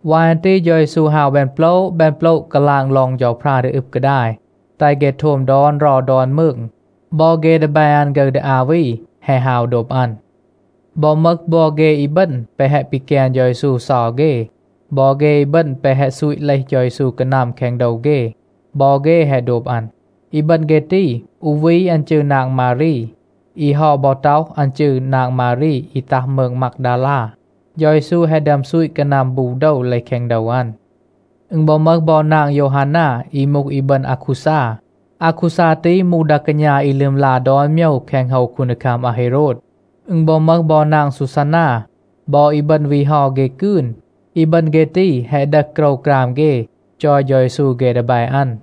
วาย อัน ตี เฌา เยซู ฮาว แบน โปละ แบน โปละ, กาลาง ลอง เฌาพรา ดี อึบ กาดาย, แตห เฆ โทม ดอน เรา ดอน มืง. บอ เฆ ดีแบ อัน ฆึร ดี อา วี แฮะ ฮาว โดบ อัน. บอ มึห บอ เฆ อีบึณ แปะ แฮะ ปีแกน เฌา เยซู เซา เฆ, บอ เฆ อีบึณ แปะ แฮะ ซูต เลห เฌา เยซู กานัม แคง โดว เฆ, บอ เฆ แฮะ โดบ อัน. อีบึณ เฆ ตี, อู วี อัน จืร นาง มารี. อี เฮา บอ ต็อห, อัน จืร นาง มารี อี ตัห มืง มากดาลา. เฌา เยซู แฮะ ดึอม ซูต กานัม บู โดว เลห แคง โดว อัน. อึณ บอ มึห บอ นาง โยวฮานา อี มูห อีบึณ อาคูซา. อาคูซา ตี มูห ดา กาณา อี ลึมลา ดอน โมยว แคง โฮว คูนดีคัม อาเฮโรด. อึณ บอ มึห บอ นาง ซูซานา บอ อีบึณ วี เฮา เฆ กืน. อีบึณ เฆ ตี แฮะ ดึห โกรวกราม เฆ, จอย เฌา เยซู เฆ ดีแบ อัน.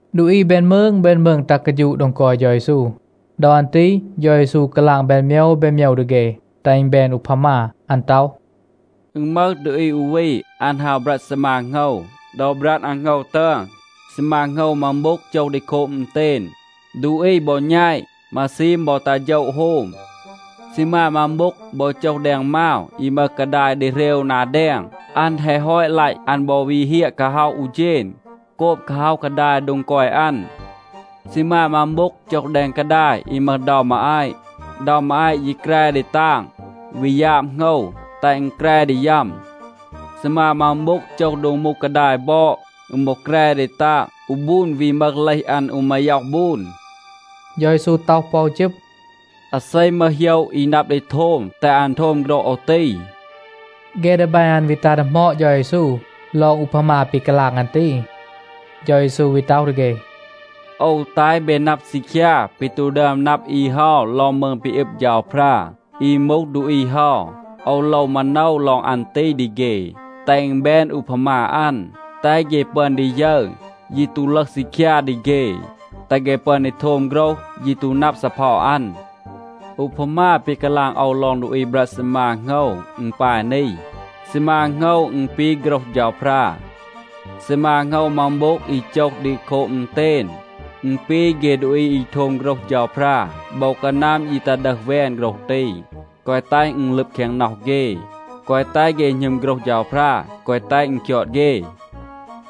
ดูอี แบน มืง แบน มืง ตัห กาฌูะ โดง กอย เฌา เยซู. ดอ อัน ตี เฌา เยซู กาลาง แบน โมยว แบน โมยว ดี เฆ, แตห อึณ แบน อูพามา. อัน ต็อห, “อึณ มึห ดูอี อู วี, อัน ฮาว บรัด ซีมา โหงว. ดอ บรัด อัน โหงว ตึอน, ซีมา โหงว มัง โบ็ง โจห ดี โคบ อึณเตณ. ดูอี บอ แณต. มาซีม บอ ตัห โฌะ โฮม. ซีมา มัง โบ็ง บอ โจห แดง มาว อี มึห กาดาย ดีเหรว นา แดง. อัน แฮะ ฮอต ลัต, อัน บอ วี เฮียะ กาฮ็อห อู เฌณ, โกบ กาฮ็อห กาดาย โดง กอย อัน. ซีมา มัง โบ็ง โจห แดง กาดาย อี มึห เดา มาอาต. เดา มาอาต ยี แกร ดี ตาง, วี ยาบ โหงว, แตห อึณ แกร ดี ยัม. ซีมา มัง โบ็ง โจห โดง มูห กาดาย บอด. อึณ บอ แกร ดี ตาง. อู บูน วี มึห เลห อัน อู มาย็อห บูน.” เฌา เยซู ต็อห ปอ อู จึบ, “อาเซ มึห โหยะ อี นับ ดี โทม, แตห อัน โทม โฆรห โอว ตี.” เฆ ดีแบ อัน วี ตัห ดีหมอด เฌา เยซู ลอง อูพามา ปี กาลาง อัน ตี. เฌา เยซู วี ต็อห ดี เฆ, “โอว แตห เบ นับ ซีคยา ปี ตู ดึอม นับ อี เฮา ลอง มืง ปี อึบ เฌาพรา. อี มูห ดูอี เฮา, โอว โลว มาโนว ลอง อัน ตี ดี เฆ, แตห อึณ แบน อูพามา อัน, แตห เฆ ปึอน ดี ยึร, ยี ตู ลึห ซีคยา ดี เฆ. แตห เฆ ปึอน ดี โทม โฆรห, ยี ตู นับ ซีเพา อัน. อูพามา ปี กาลาง โอว ลอง ดูอี บรัด ซีมา โหงว, อึณ ปาย นี. ซีมา โหงว, อึณ ปี โฆรห เฌาพรา. ซีมา โหงว มัง โบ็ง อี โจห ดี โคบ อึณเตณ, อึณ ปี เฆ ดูอี อี โทม โฆรห เฌาพรา. โบว กานัม ยี ตัห ดึห แวน โฆรห ตี, แกวะ แตห อึณ ลึบ แคง น็อห เฆ, แกวะ แตห เฆ หณึม โฆรห เฌาพรา, แกวะ แตห อึณ คยอด เฆ.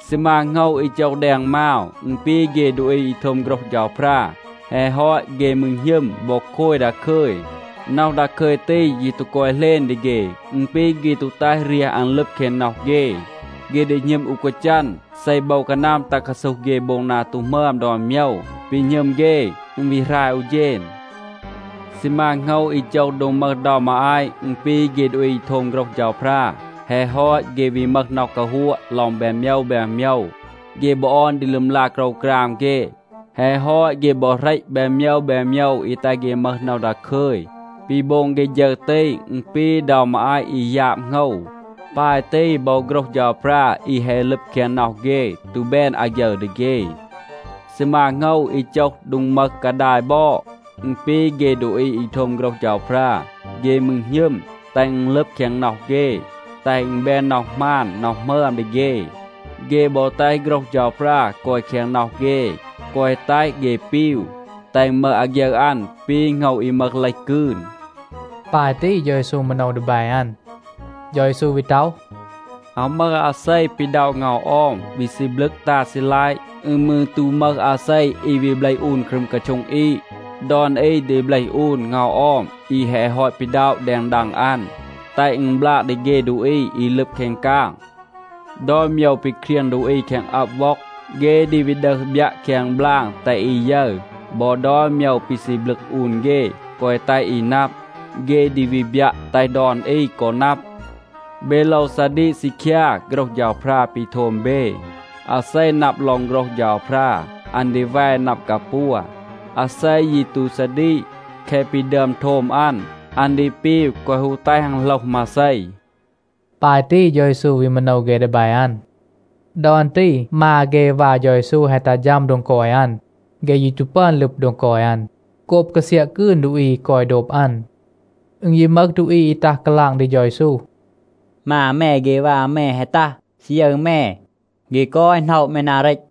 ซีมา โหงว อี โจห แดง มาว, อึณ ปี เฆ ดูอี อี โทม โฆรห เฌาพรา. แฮะ ฮอต, เฆ มืร หณึม บอ โคย ดาคึย. น็อห ดาคึย ตี ยี ตู กอย เหลณ ดี เฆ. อึณ ปี เฆ ตู แตห เรียห อัน ลึบ แคง น็อห เฆ. เฆ ดี หณึม อู กาจัน. เซ โบว กานัม ตัห กาซูห เฆ โบง นา ตู หมึอม ดอน โมยว, ปี หณึม เฆ, อึณ วี หราย อู เฌณ. ซีมา โหงว อี โจห โดง มึห เดา มาอาต, อึณ ปี เฆ ดูอี โทม โฆรห เฌาพรา. แฮะ ฮอต, เฆ วี มึห น็อห กาฮัวะ ลอง แบน โมยว แบน โมยว. เฆ บอ ออน ดี ลึมลา โกรวกราม เฆ. แฮะ ฮอต เฆ บอ เหรต แบน โมยว แบน โมยว อี แตห เฆ มึห น็อห ดาคึย. ปี โบง เฆ ฌึร ตี, อึณ ปี, เดา มาอาต อี ยาบ โหงว. ปาย ตี บอ โฆรห เฌาพรา อี แฮะ ลึบ แคง น็อห เฆ ตู แบน อาฆยึร ดี เฆ. ซีมา โหงว อี โจห โดง มึห กาดาย บอด, อึณ ปี เฆ ดูอี อี โทม โฆรห เฌาพรา. เฆ มืร หณึม, แตห อึณ ลึบ แคง น็อห เฆ, แตห อึณ แบน น็อห หมาน น็อห หมึอม ดี เฆ. เฆ บอ แตห โฆรห เฌาพรา กอย แคง น็อห เฆ, แกวะ แตห เฆ ปีว, แตห อึณ มึห อาฆยึร อัน ปี โหงว อี มึห เลห กืน.” ปาย ตี เฌา เยซู มาโนว ดีแบ อัน. เฌา เยซู วี ต็อห, “อาว มึห อาเซ, อี ปีด็อะ เงา ออม, วี ซีบลึก ตา ซีลัยะ. อึณ มืร ตู มึห อาเซ อี วี เบลห อูน ครึม กาโช็ง อีด. ดอน อี ดี เบลห อูน เงา ออม อี แฮะ ฮอต ปีด็อะ แดง ดัง อัน, แตห อึณ บลาง ดี เฆ ดูอี อี ลึบ แคง กาง. ดอน โมยว ปี เครียง ดูอี แคง อับ ว็อง, เฆ ดี วี ดึห บยัะ แคง บลาง แตห อี ยึร. บอ ดอน โมยว ปี ซีบลึก อูน เฆ แกวะ แตห อี นับ, เฆ ดี วี บยัะ, แตห ดอน อี กอ นับ. เบ โลว ซาดีก ซีคยา โฆรห เฌาพรา ปี โทม เบ. อาเซ นับ ลอง โฆรห เฌาพรา, อัน ดี แว นับ กาปัว. อาเซ ยี ตู ซาดีก, แคะ ปี ดึอม โทม อัน, อัน ดี ปีว, แกวะ ฮู แตห อัน โหลห มาเซ.” ปาย ตี เฌา เยซู วี มาโนว เฆ ดีแบ อัน. ดอ อัน ตี มา เฆ วา เฌา เยซู แฮะ ตัห ฌัม โดง กอย อัน. เฆ ยี ตู ปึอน ลึบ โดง กอย อัน, โกบ กาเซียะ กืน ดูอี อี กอย โดบ อัน. อึณ ยี มึห ดูอี อี ตัห กาลาง ดี เฌา เยซู, “มา แม เฆ วา แม แฮะ ตัห, ซี ยึร แม. เฆ กอย หน็อะ แม นา เรต.”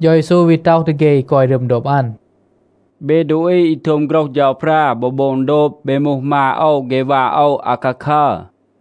เฌา เยซู วี ต็อห ดี เฆ อี กอย รึม โดบ อัน “เบ ดูอี อี โทม โฆรห เฌาพรา บอ โบง โดบ, เบ มูห มา โอว เฆ วา โอว อาคาคัร.”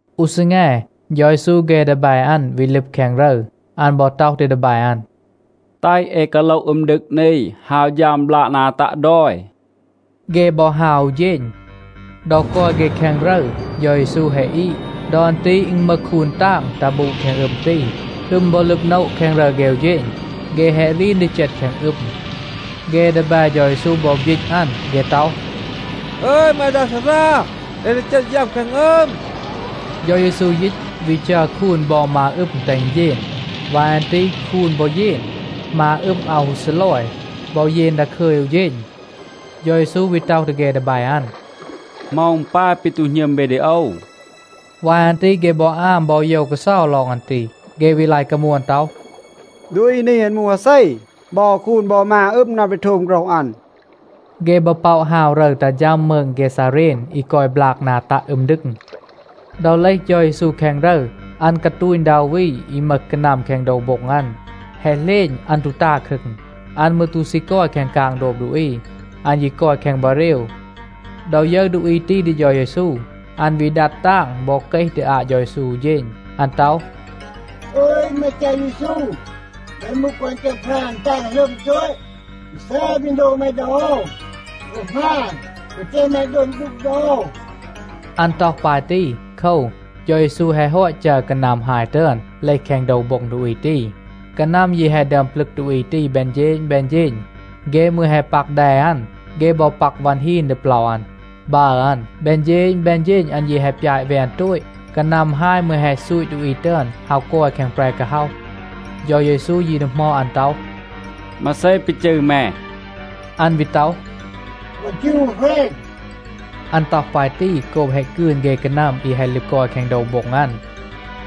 อู ซีแง, เฌา เยซู เฆ ดีแบ อัน วี ลึบ แคง รึร. อัน บอ ต็อห ดี ดีแบ อัน, “แตห เอ กาโลห อึม ดึง นี, ฮาว ฌัม บลาก นา ตัะ ดอย.” เฆ บอ ฮาว อู เฌณ. ดอ กอย เฆ แคง รึร, เฌา เยซู แฮะ อีด. ดอ อัน ตี อึณ มึห คูน ตาง ตัห บูด แคง อึม ตี. อึม บอ ลึบ โนะ แคง รึร เฆ อู เฌณ. เฆ แฮะ รีน ดี เจต แคง อึม. เฆ ดีแบ เฌา เยซู บอ บยีต อัน. เฆ ต็อห, “อึย แม ดา ซารา, เอ ดี เจต ยัม แคง อึม.” เฌา เยซู ยีต, วี จัร คูน บอ มา อึม แตห อึณ เยน. วาย อัน ตี คูน บอ เยน. มา อึม อาว ฮู ซีลอย, บอ เยน ดาคึย อู เฌณ. เฌา เยซู วี ต็อห ดี เฆ ดีแบ อัน, “เหมา อึณ ปาย ปี ตู หณึม เบ ดี โอว?” วาย อัน ตี เฆ บอ อาม บอ โยว กาเซา ลอง อัน ตี. เฆ วี ลาย กามวน ต็อห, “ดูอี นี, อัน มูห อาเซ? บอ คูน บอ มา อึม นับ ดี โทม โฆรห อัน.” เฆ บอ ป็อะ ฮาว รึร ตัห ฌัม มืง เกซาเรน อี กอย บลาก นา ตัะ อึม ดึง. ดอ เลห เฌา เยซู แคง รึร, อัน กาตูณ ดา อู วี อี มึห กานัม แคง โดว โบ็ง อัน. แฮะ เหลณ, อัน ตู ตา ครึง. อัน มืร ตู ซี กอย แคง กาง โดบ ดูอี. อัน ยี กอย แคง บาเรว. ดอ ยึร ดูอี ตี ดี เฌา เยซู, อัน วี ดัด ตาง บอ เกห ดี อาต เฌา เยซู อู เฌณ. อัน ต็อห, “อึย แม เฌา เยซู, แม มูห ฆอน เฌาพรา อี ตาง หลึอม โตต. มาเซ ปี โลว แม ดี โอว? โอว หมาณ, แกวะ แตห แม ดัว ดูก ดี โอว.” อัน ต็อห ปาย ตี โคว, เฌา เยซู แฮะ ฮอต จัร กานัม ฮาย ตึอน เลห แคง โดว โบ็ง ดูอี ตี. กานัม ยี แฮะ ดึอม ปลึก ดูอี ตี แบน เฌณ แบน เฌณ. เฆ มืร แฮะ ปัก แด อัน. เฆ บอ ปัก วัน ฮีน ดี เปลา อัน, บัร อัน. แบน เฌณ แบน เฌณ อัน ยี แฮะ ปยาต แวน โตต. กานัม ฮาย มืร แฮะ ซูต ดูอี ตึอน ฮาว กอย แคง แปร กาฮ็อห. เฌา เยซู ยี ดีหมอด อัน ต็อห, “มาเซ ปี จืร แม?” อัน วี ต็อห, “โอว จืร อู แหรณ,” อัน ต็อห ปาย ตี โกบ แฮะ กืน เฆ กานัม อี แฮะ ลึบ กอย แคง โดว โบ็ง อัน.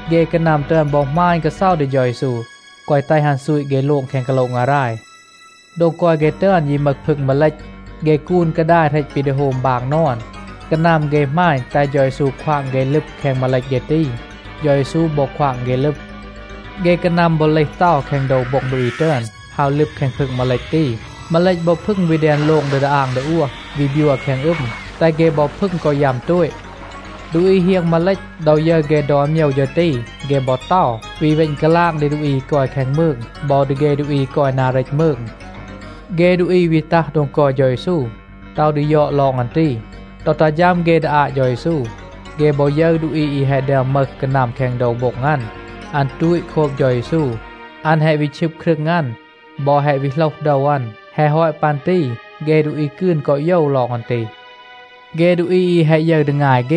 เฆ กานัม ตึอน บอ หมาณ กาเซา ดี เฌา เยซู, แกวะ แตห อัน ซูต เฆ โลง แคง กาโละ งาราย. โดง กอย เฆ ตึอน ยี มึห พึง มาเลต. เฆ กูน กาดาย เหรต ปี ดี โฮม บาง นอน. กานัม เฆ หมาณ, แตห เฌา เยซู ควาง เฆ ลึบ แคง มาเลต เฆ ตี. เฌา เยซู บอ ควาง เฆ ลึบ. เฆ กานัม บอ เลห เตา แคง โดว โบ็ง ดูอี ตึอน, ฮาว ลึบ แคง พึง มาเลต ตี. มาเลต บอ พึง วี แดน โลง ดี ดาอาง ดาอวห, วี บยัว แคง อึม, แตห เฆ บอ พึง กอ ยัม โตต. ดูอี เฮียง มาเลต, ดอ ยึร เฆ ดอน โมยว ฌึร ตี, เฆ บอ เตา, วี เวณ กาลาง ดี ดูอี อี กอย แคง มืง บอ ดี เฆ ดูอี อี กอย นา เรต มืง. เฆ ดูอี วี ตัห โดง กอย เฌา เยซู, ต็อห ดี ยอด ลอง อัน ตี. ดอ ตัห ฌัม เฆ ดี อาต เฌา เยซู, เฆ บอ ยึร ดูอี อี แฮะ ดึอม มึห กานัม แคง โดว โบ็ง อัน. อัน ตูต โคบ เฌา เยซู. อัน แฮะ วี ชึบ ครึง อัน บอ แฮะ วี โหลห โดว อัน. แฮะ ฮอต ปัน ตี เฆ ดูอี กืน กอ โยว ลอง อัน ตี. เฆ ดูอี อี แฮะ ยึร ดี งาย เฆ,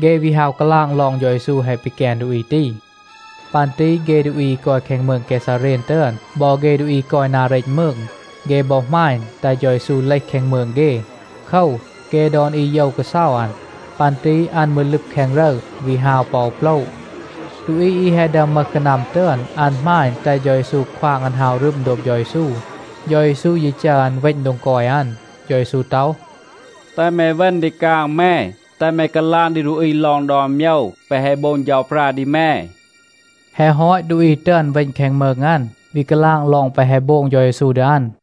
เฆ วี ฮาว กาลาง ลอง เฌา เยซู แฮะ ปีแกน ดูอี ตี. ปัน ตี เฆ ดูอี อี กอย แคง มืง เกซาเรน ตึอน บอ เฆ ดูอี อี กอย นา เรต มืง, เฆ บอ หมาณ, แตห เฌา เยซู เลห แคง มืง เฆ. โคว, เฆ ดอน อี โยว กาเซา อัน. ปัน ตี อัน มืร ลึบ แคง รึร, วี ฮาว ปอ อู โปละ. ดูอี อี แฮะ ดึอม มึห กานัม ตึอน, อัน หมาณ, แตห เฌา เยซู ควาง อัน ฮาว รึม โดบ เฌา เยซู. เฌา เยซู ยี จัร อัน เวณ โดง กอย อัน. เฌา เยซู ต็อห, “แตห แม เวณ ดี กาง แม. แตห แม กาลาง ดี ดูอี ลอง ดอน โมยว แปะ แฮะ โบง เฌาพรา ดี แม.” แฮะ ฮอต, ดูอี ตึอน เวณ แคง มืง อัน, วี กาลาง ลอง แปะ แฮะ โบง เฌา เยซู ดี อัน.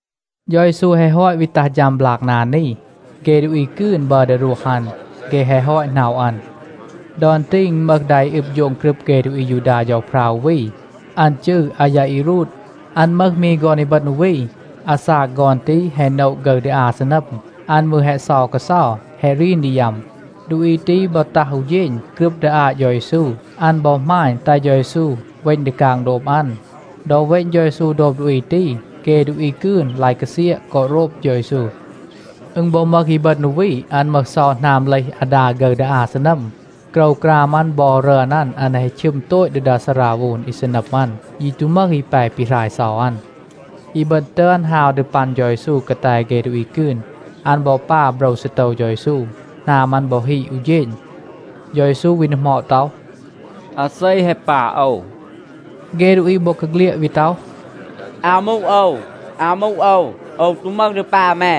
เฌา เยซู แฮะ ฮอต วี ตัห ฌัม บลาก นา นี, เฆ ดูอี กืน บัร ดี รวห อัน. เฆ แฮะ ฮอต หน็อะ อัน. ดอ อัน ตี อึณ มึห ดา อี อึบ โฌง กรึบ เฆ ดูอี อายูดา เฌาพรา อู วี. อัน จืร อายาอีรูด. อัน มึห มี ฆอน อีบึณ อู วี. อาซาก ฆอน ตี แฮะ โนะ ฆึร ดี อา ซีนัม. อัน มืร แฮะ เซา กาเซา. แฮะ รีน ดี ยัม. ดูอี ตี บอ ตัห อู เฌณ, กรึบ ดี อาต เฌา เยซู. อัน บอ หมาณ, แตห เฌา เยซู เวณ ดี กาง โดบ อัน. ดอ เวณ เฌา เยซู โดบ ดูอี ตี, เฆ ดูอี กืน ลาย กาเซียะ กอ โรบ เฌา เยซู. อึณ บอ มึห อีบึณ อู วี. อัน มึห เซา หนาม เลห อาดา ฆึร ดี อา ซีนัม. โกรวกราม อัน บอ รึอน อัน, อัน แฮะ ชึม โตต ดี ซาราโวน อี ซีนัม อัน. ยี ตู มึห อี แป ปีหราย เซา อัน. อีบึณ ตึอน ฮาว ดี ปัน เฌา เยซู กาแต เฆ ดูอี กืน. อัน บอ ปา โบรว ซีโตว เฌา เยซู. หนาม อัน บอ ฮีด อู เฌณ. เฌา เยซู วี ดีหมอด ต็อห, “อาเซ แฮะ ปา โอว?” เฆ ดูอี บอกาเฆลียด วี ต็อห, “อาว มูห โอว, อาว มูห โอว, โอว ตู มึห ดี ปา แม.”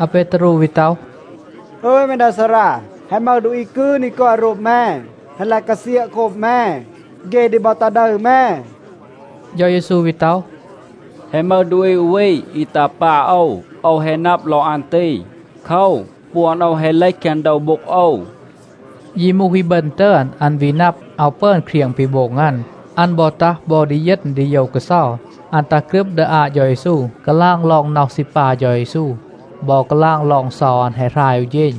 อาเปตารู วี ต็อห, “อึย แม ดา ซารา, แฮะ มึห ดูอี กืน อี กอย โรบ แม, แฮะ ลาย กาเซียะ โคบ แม. เฆ ดี บอ ตา ดึร แม.” เฌา เยซู วี ต็อห, “แฮะ มึห ดูอี อู วี อี ตา ปา โอว. โอว แฮะ นับ ลอง อัน ตี. โคว, ปวน โอว แฮะ เลห แคง โดว โบ็ง โอว.” ยี มูห อีบึณ ตึอน, อัน วี นับ, อาว ปึอน เครียง ปี โบง อัน. อัน บอ ตัห บอ ดีเยณ ดีโยว กาเซา. อัน ตัห กรึบ ดี อาต เฌา เยซู, กาลาง ลอง น็อห ซี ปา เฌา เยซู บอ กาลาง ลอง เซา อัน แฮะ หราย อู เฌณ.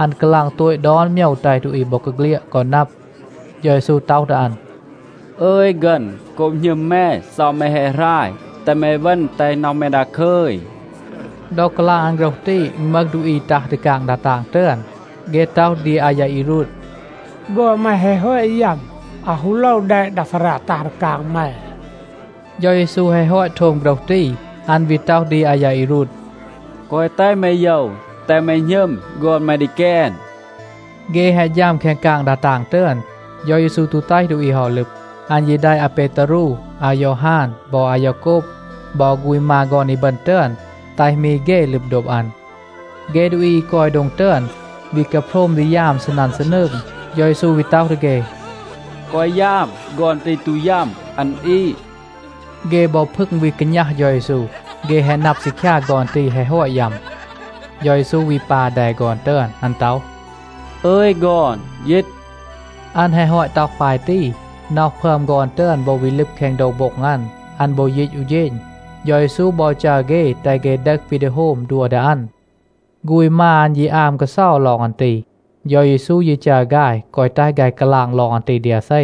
อัน กาลาง โตต ดอน โมยว แตห ดูอี บอกาเฆลียด กอ นับ. เฌา เยซู ต็อห ดี อัน, “อึย ฆึณ, โกบ หณึม แม, เซา แม แฮะ หราย. แตห แม เวณ, แตห น็อห แม ดาคึย.” ดอ กาลาง อัน โฆรห ตี, อึณ มึห ดูอี ตัห ดี กาง ดา ตาง ตึอน. เฆ ต็อห ดี อายาอีรูด, “ฆอน แม แฮะ ฮอต ยัม. อาว ฮู โลว แดะ ดา ซารา ตัห ดี กาง แม.” เฌา เยซู แฮะ ฮอต โทม โฆรห ตี, อัน วี ต็อห ดี อายาอีรูด, “แกวะ แตห แม โยว. แตห แม หณึม. ฆอน แม ดี แกน.” เฆ แฮะ ฌัม แคง กาง ดา ตาง ตึอน, เฌา เยซู ตู แตห ดูอี เฮา ลึบ. อัน ยี แดะ อาเปตารู, อายอฮาน บอ อายาโกบ บอ ฆูณ มา ฆอน อีบึณ ตึอน, แตห มี เฆ ลึบ โดบ อัน. เฆ ดูอี อี กอย โดง ตึอน วี กาโพรม ดี ยาม ซีนัน ซีนืง. เฌา เยซู วี ต็อห ดี เฆ, “แกวะ ยาม, ฆอน ตี ตู ยัม. อัน อีด.” เฆ บอ พึง วี กาณัห เฌา เยซู, เฆ แฮะ นับ ซีคยา ฆอน ตี แฮะ ฮอต ยัม. เฌา เยซู วี ปา แด ฆอน ตึอน. อัน ต็อห, “อึย ฆอน, ยีต.” อัน แฮะ ฮอต ต็อห ปาย ตี, น็อห พึอม ฆอน ตึอน บอ วี ลึบ แคง โดว โบ็ง อัน. อัน บอ ยีต อู เฌณ. เฌา เยซู บอ จัร เฆ, แตห เฆ ดึห ปี ดี โฮม, ดัว ดี อัน. ฆูณ มา อัน ยี อาม กาเซา ลอง อัน ตี. เฌา เยซู ยี จัร ฆาย แกวะ แตห ฆาย กาลาง ลอง อัน ตี ดี อาเซ.